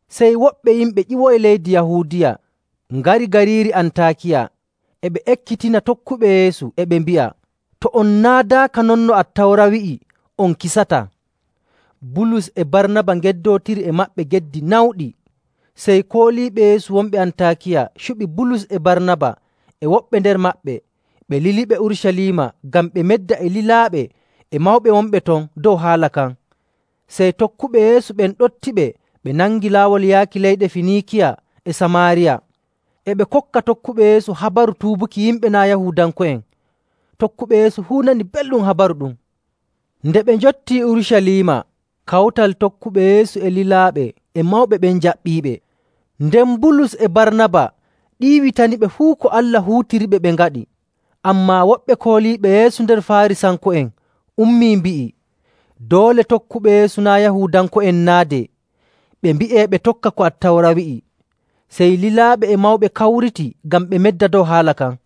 Sey woɓɓe yimɓe ƴiwoyi leydi Yahuudiya ngari gariiri Antaakiya, e ɓe ekkitina tokkuɓe Yeesu, e ɓe mbi'a, “To on naadaaka non no Attawra wi'i on kisataa.”. Bulus e Barnaba ngeddootiri e maɓɓe geddi nawɗi. Sey kooliiɓe Yeesu wonɓe Antaakiya cuɓi Bulus e Barnaba e woɓɓe nder maɓɓe, ɓe liliɓe Urucaliima ngam ɓe medda e lilaaɓe e mawɓe wonɓe ton dow haala kan. Sey tokkuɓe Yeesu ɓen ɗoftiɓe ɓe nangi laawol yaaki leyɗe Finiikiya e Samaariya, e ɓe kokka tokkuɓe Yeesu habaru tuubuki yimɓe naa' Yahuudanko'en. Tokkuɓe Yeesu fuu nani belɗum habaru ɗum. Nde ɓe njottii Urucaliima, kawtal tokkuɓe Yeesu e lilaaɓe e mawɓe ɓen njaɓɓiiɓe. Nden Bulus e Barnaba ɗiiwitaniɓe fuu ko Allah huutiniriɓe ɓe ngaɗi. Ammaa woɓɓe kooliiɓe Yeesu nder Faarisanko'en ummii, mbi'i, “Doole tokkuɓe Yeesu naa' Yahuudanko'en naadee, ɓe mbi'ee ɓe tokka ko Attawra wi'i.” Sey lilaaɓe e mawɓe kawriti ngam ɓe medda dow haala kan.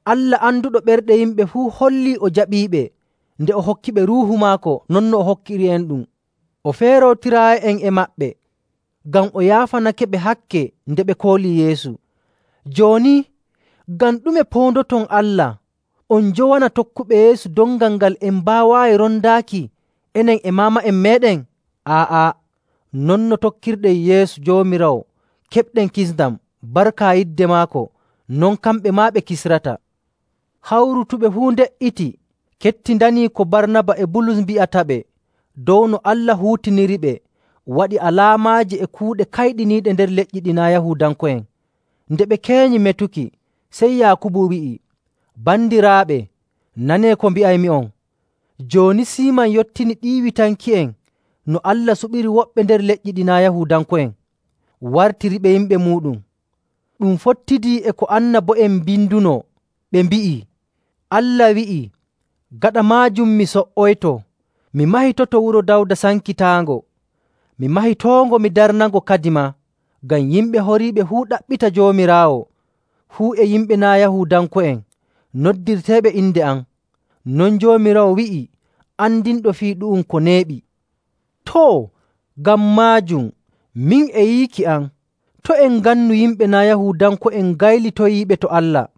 Allah anduɗo ɓerɗe yimɓe fuu hollii o jaɓiiɓe nde o hokkiɓe Ruuhu maako non no o hokkiri'enɗum.. O feerootiraayi'en e maɓɓe, ngam o yaafanakeɓe hakke nde ɓe koolii Yeesu. Jooni, ngam ɗume poondoton Allah on njowana tokkuɓe Yeesu dongal ngal en mbaawaayi rondaaki, enen e maama'en meeɗen? Aa'a! Non no tokkirɗen Yeesu Joomiraawo keɓɗen kisndam barka yidde maako, non kamɓe maa ɓe kisrata.” Hawrutuɓe fuu nde''iti kettindanii ko Barnaba e Bulus mbi'ataɓe dow no Allah huutiniriɓe waɗi alaamaaji e kuuɗe kayɗiniiɗe nder leƴƴi ɗi naa' Yahuudanko'en. Nde ɓe keenyi metuki, sey Yaakubu wi'i, “Bandiraaɓe, nanee ko mbi'aymi'on! Jooni Siiman yottini ɗiiwitanki'en no Allah suɓiri woɓɓe nder leƴƴi ɗi naa' Yahuudanko'en, wartiriɓe yimɓe muuɗum. Ɗum fottidii e ko annabo'en mbindunoo, ɓe mbi'ii, ‘Allah wi'ii, “Gaɗa maajum, mi so''oyto, mi mahitotoo wuro Dawda sankitaango. Mi mahitoongo, mi darnango kadimaa, ngam yimɓe horiiɓe fuu ɗaɓɓita Joomiraawo, fuu e yimɓe naa' Yahuudanko'en noddirteeɓe inde am. Non Joomiraawo wi'i, andinɗo fii ɗu'um ko neeɓi.”’. “Too, ngam maajum min e yiiki am, to' en ngannu yimɓe naa' Yahuudanko'en ngaylitoyiiɓe to Allah.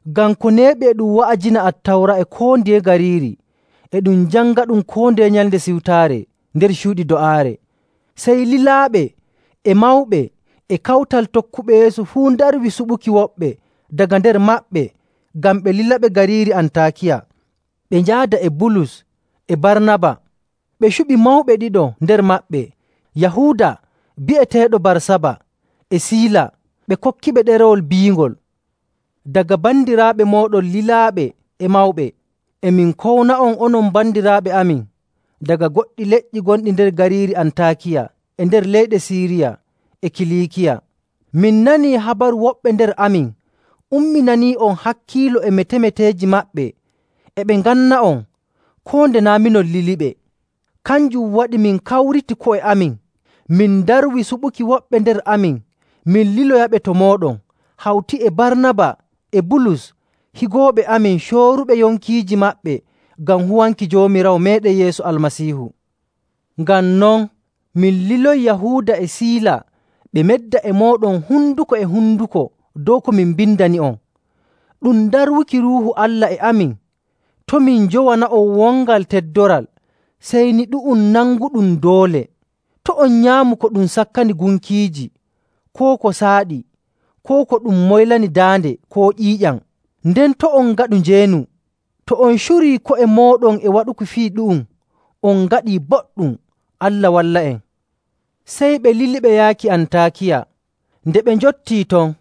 Ngam ko neeɓi e ɗum wa'ajina Attawra e koo ndiye gariiri, e ɗum jangaɗum koo ndeye Nyalnde Siwtaare nder cuuɗi do'aare.” Sey lilaaɓe e mawɓe e kawtal tokkuɓe Yeesu fuu ndarwi suɓuki woɓɓe daga nder maɓɓe ngam ɓe lilaɓe gariiri Antaakiya, ɓe njaada e Bulus e Barnaba. Ɓe cuɓi mawɓe ɗiɗo nder maɓɓe: Yahuuda, bi'eteeɗo Barsaba, e Siila. Ɓe kokkiɓe ɗerewol biingol: “Daga bandiraaɓe mooɗon lilaaɓe e mawɓe, e min kowna'on, onon bandiraaɓe amin daga goɗɗi leƴƴi gonɗi nder gariiri Antaakiya e nder leyɗe Siiriya e Kiliikiya. Min nanii habaru woɓɓe nder amin umminanii'on hakkiilo e metemeteeji maɓɓe e ɓe nganna'on, koo nde naa' minon liliɓe. Kanjum waɗi min kawriti ko'e amin min ndarwi suɓuki woɓɓe nder amin min liloyaɓe to mooɗon, hawti e Barnaba e Bulus higooɓe amin, cooruɓe yonkiiji maɓɓe ngam huwanki Joomiraawo meeɗen Yeesu Almasiihu. Ngam non min liloyi Yahuuda e Siila ɓe medda e mooɗon honduko e honduko dow ko min mbindani'on. Ɗum darwuki Ruuhu Allah e amin, to' min njowana'on wongal teddoral, sey ni ɗu'um nanguɗum doole: to' on nyaamu ko ɗum sakkani gunkiiji koo ko saaɗi koo ko ɗum moylani daande koo ƴiiƴam, nden to' on ngaɗu njeenu. To on curii ko'e mooɗon e waɗuki fii ɗu'um on ngaɗii boɗɗum. Allah walla'en!” Sey ɓe liliɓe yaaki Antaakiya. Nde ɓe njottii ton,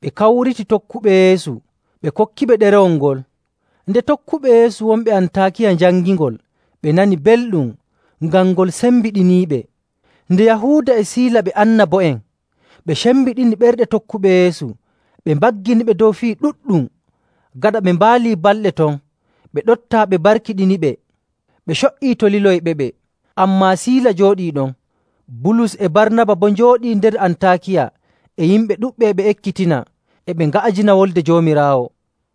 ɓe kawriti tokkuɓe Yeesu, ɓe kokkiɓe ɗerewol ngol. Nde tokkuɓe Yeesu wonɓe Antaakiya njangingol, ɓe nani belɗum ngam ngol sembiɗiniiɓe. Nde Yahuuda e Siila ɓe annabo'en, ɓe cembiɗini ɓerɗe tokkuɓe Yeesu, ɓe mbagginiɓe dow fii ɗuɗɗum. Gaɗa ɓe mbaalii balɗe ton, ɓe ɗoftaa ɓe mbarkiɗiniɓe, ɓe co''ii to liloyɓeɓe. [Ammaa Siila jooɗii ɗon.] Bulus e Barnaba boo njooɗii nder Antaakiya e yimɓe ɗuɗɓe e ɓe ekkitina, e ɓe nga'ajina Wolde Joomiraawo.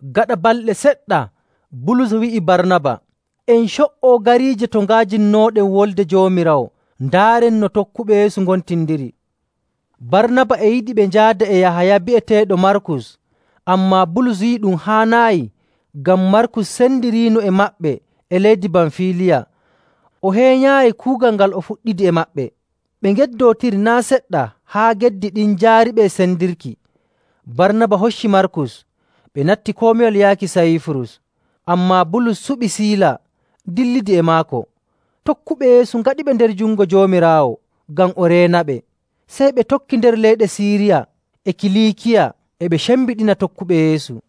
Gaɗa balɗe seɗɗa Bulus wi'i Barnaba, “En co''o gariije to nga'ajinnooɗen Wolde Joomiraawo, ndaaren no tokkuɓe Yeesu ngontindiri.” Barnaba e yiɗi ɓe njaada e Yahaya bi'eteeɗo Markus. Ammaa Bulus yi'i ɗum haanaayi, ngam Markus sendiriino e maɓɓe e leydi Bamfiiliya, o heenyaayi kuugal ngal o fuɗɗidi e maɓɓe.. Ɓe ngeddootiri naa' seɗɗa haa geddi ɗin njaariɓe e sendirki. Barnaba hocci Markus, ɓe natti komiwal yaaki Sayiifurus. Ammaa Bulus suɓi Siila, dillidi e maako. Tokkuɓe Yeesu ngaɗiɓe nder jungo Joomiraawo ngam o reenaɓe. Sey ɓe tokki nder leyɗe Siiriya e Kiliikiya, e ɓe cembiɗina tokkuɓe Yeesu.